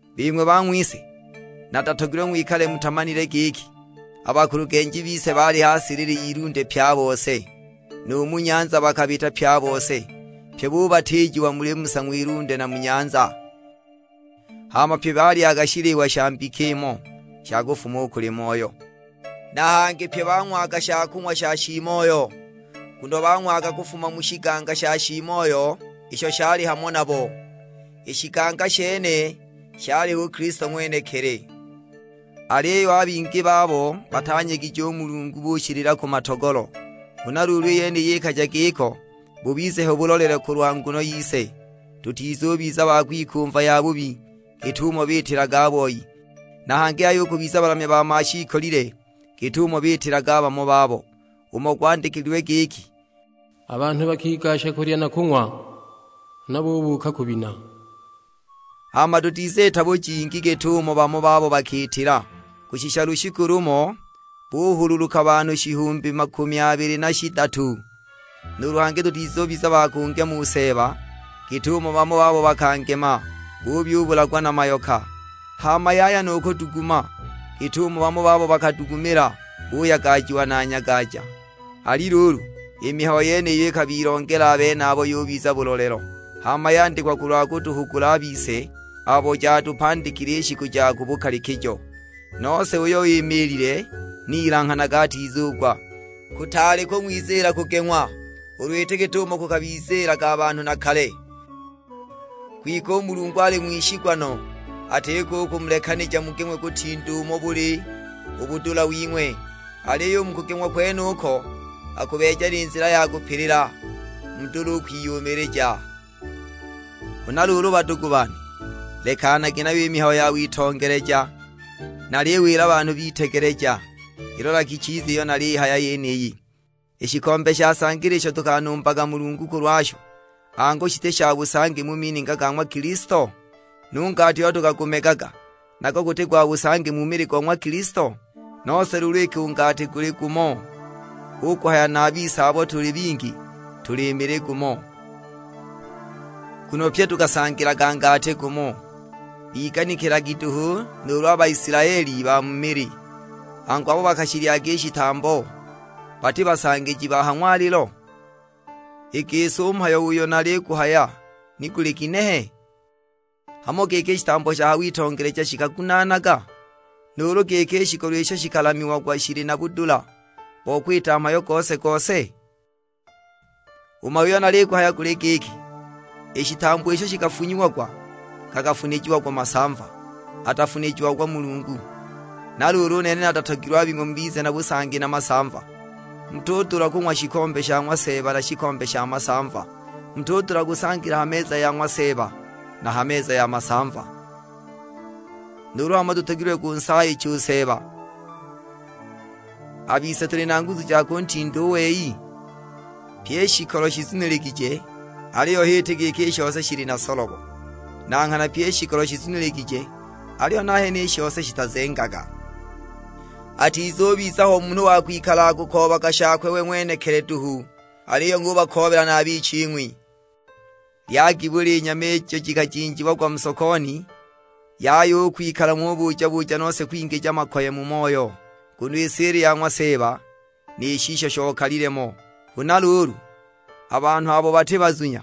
Bing'we bang'wise, natatogilwe ng'wikale mutamanile giki, a bakulugenji bise baali ha silili y'ilunde pye a bose, nu mu nyanza bakabita pye a bose; pye bubatiijiwa muli Musa, ng'wilunde na mu nyanza. Hama pye balyaga shiliwa sha mbika imo, sha kufuma u kuli Moyo. Na hangi pye bang'waga shakung'wa sha shiimoyo, nguno bang'waga kufuma mu shiganga sha shiimoyo isho shali hamo nabo nuulu: shabalondeelaga'; i shiganga shene shali h'u Kilisto ng'wenekili. Aliyo a bingi babo batanyegije u Mulungu, bushilila ku matogolo. Huna luulu i yeniyi ikaja giko, bubize ho bulolelo kulwa nguno yise, tutizubiza ba kwikumva yabubi git'umo biitilaga a boi. Na hangi yaya u kubiza balamya ba mashiikolile git'umo biitilaga bamo babo: umo gwandikilwe giki, "A banhu bakigasha kulya na kung'wa, huna bubuuka kubina!" Hama dutiziita bujingi git'umo bamo babo bakiitila, kushisha lushiku lumo buhululuka banhu shihumbi makumi abili na shidatu! Nuulu hangi tutizubiza ba kungema u Seeba git'umo bamo babo bakangema; buyubulagwa na mayoka! Hama yaya nu kuduguma, git'umo bamo babo bakadugumila, buyagajiwa na nyagaja! Ali luulu, i mihayo yeniyo ikabilongela a benabo, yubiza bulolelo; hama yandikwa kulwa kutuhugula a bise abo jatupandikile i shiku ja ku bukalikijo. Nose uyo imiilile ni ilanghanage atizugwa. Kutaali kung'wiziila kugeng'wa, ulu iti git'umo kukabiziilaga banhu na kale. Kwike u Mulungu ali ng'wishigwa no, atiko u kumulekanija mugeng'we kutinda umo buli u budula wing'we; aliyo u mu kugeng'wa kwenuko, akubeeja ni nzila ya kupilila, mudule u kwiyumilija. Huna luulu badugu bane, lekanagi nayo i mihayo ya witongeleja. Naliwila banhu bitegeleja, ilolagi chiza iyo naliyihaya yeniyi. I shikombe sha sangila isho tukanumbaga Mulungu kulwasho, angu shiti sha busangi mu mininga ga ng'wa Kilisto? Nu ngati uyo tukagumegaga, nago guti gwa busangi mu mili go ng'wa Kilisto? Nose luulu iki u ngati guli gumo, hu kuhaya na a bise abo tuli bingi tuli mili gumo, nguno pyi tukasangilaga ngati gumo. Biganikilagi duhu nuulu a Baisilaeli ba mu mili, angu abo bakashilyaga i shitambo, bati basangiji ba ha ng'walilo? I gisi u mhayo uyo naliguhaya ni guli ginehe? Hamo giki i shitambo sha ha witongeleja shikagunaanaga? Nuulu giki i shikolo isho shikalamiagwa shili na budula bo kwita mhayo gose-gose? U mhayo uyo naliguhaya guli giki, i shitambo isho shikafunyiagwa gakafunijiagwa masamva, atafunijiagwa Mulungu; na luulu u nene natatogilwe a bing'we mubize na busangi na masamva. Mutudula kung'wa shikombe sha ng'wa Seeba na shikombe sha masamva; mutudula kusangila ha meza ya ng'wa Seeba na ha meza ya masamva! Nuulu hamo tutogilwe kunsaayicha u Seeba! A bise tuli na nguzu ja kuntinda u wei? "Pyi i shikolo shizuniligije, aliyo h'iti giki i shose shili na solobo; na nghana pyi i shikolo shizuniligije, aliyo nahene i shose shitazengaga." Atizubiza ho munhu wa kwikala akukoobaga shakwe we ng'wenekili duhu; aliyo ng'ubakoobela na a biching'wi. Lyagi buli nyama ijo jikajinjiagwa mu sokoni, yaya u kwikala ng'ubuja-buja nose kwingija makoye mu moyo. Nguno i si ili ya ng'wa Seeba, ni shisho shokalile mo. Huna luulu, a banhu abo bati bazunya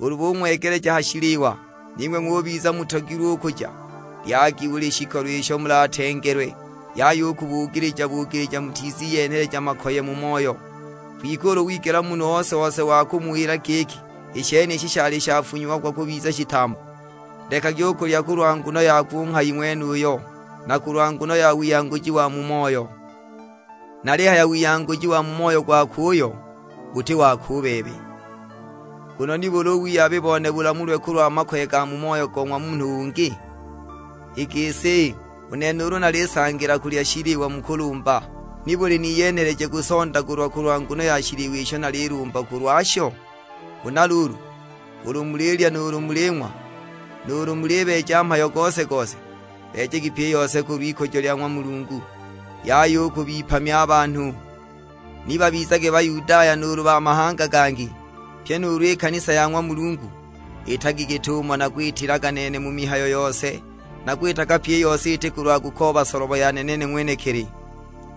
ulu bung'wegeleja ha shiliwa, ning'we ng'ubiza mutogilwe u kuja, lyagi buli shikolo isho mulatengelwe; yaya u kubugilija-bugilija mutiziyenhela makoye mu moyo. Kwike ulu wigela munhu ose-ose wa kumuwila giki, "I shenishi shali shafunyiagwa kubiza shitambo," lekagi u kulya kulwa nguno yakwe u nghayi ng'wenuyo, na kulwa nguno ya wiyanguji wa mu moyo. Nalihaya wiyanguji wa mu moyo gwakwe uyo; buti wako u bebe. Nguno nibuli u wiyabi bone bulamulwe kulwa makoye ga mu moyo go ng'wa munhu ungi? I gisi, u nene ulu nalisangila kulya shiliwa mu kulumba, nibuli niyenheleje kusondagulwa kulwa nguno ya shiliwa isho nalilumba kulwasho? Huna luulu, ulu mulilya nuulu muling'wa, nuulu mulibeeja mhayo gose-gose; beejagi pyi i yose kulw'ikujo lya ng'wa Mulungu. Yaya u kubipamya a banhu; ni babizage Bayudaya nuulu ba mahanga gangi, pyi nuulu i kanisa ya ng'wa Mulungu. Itagi git'umo nakwitilaga nene mu mihayo yose. Nakwitaga pyi i yose iti kulwa kukooba solobo yane nene ng'wenekili,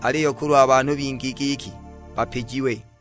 aliyo kulwa banhu bingi, giki bapijiwe.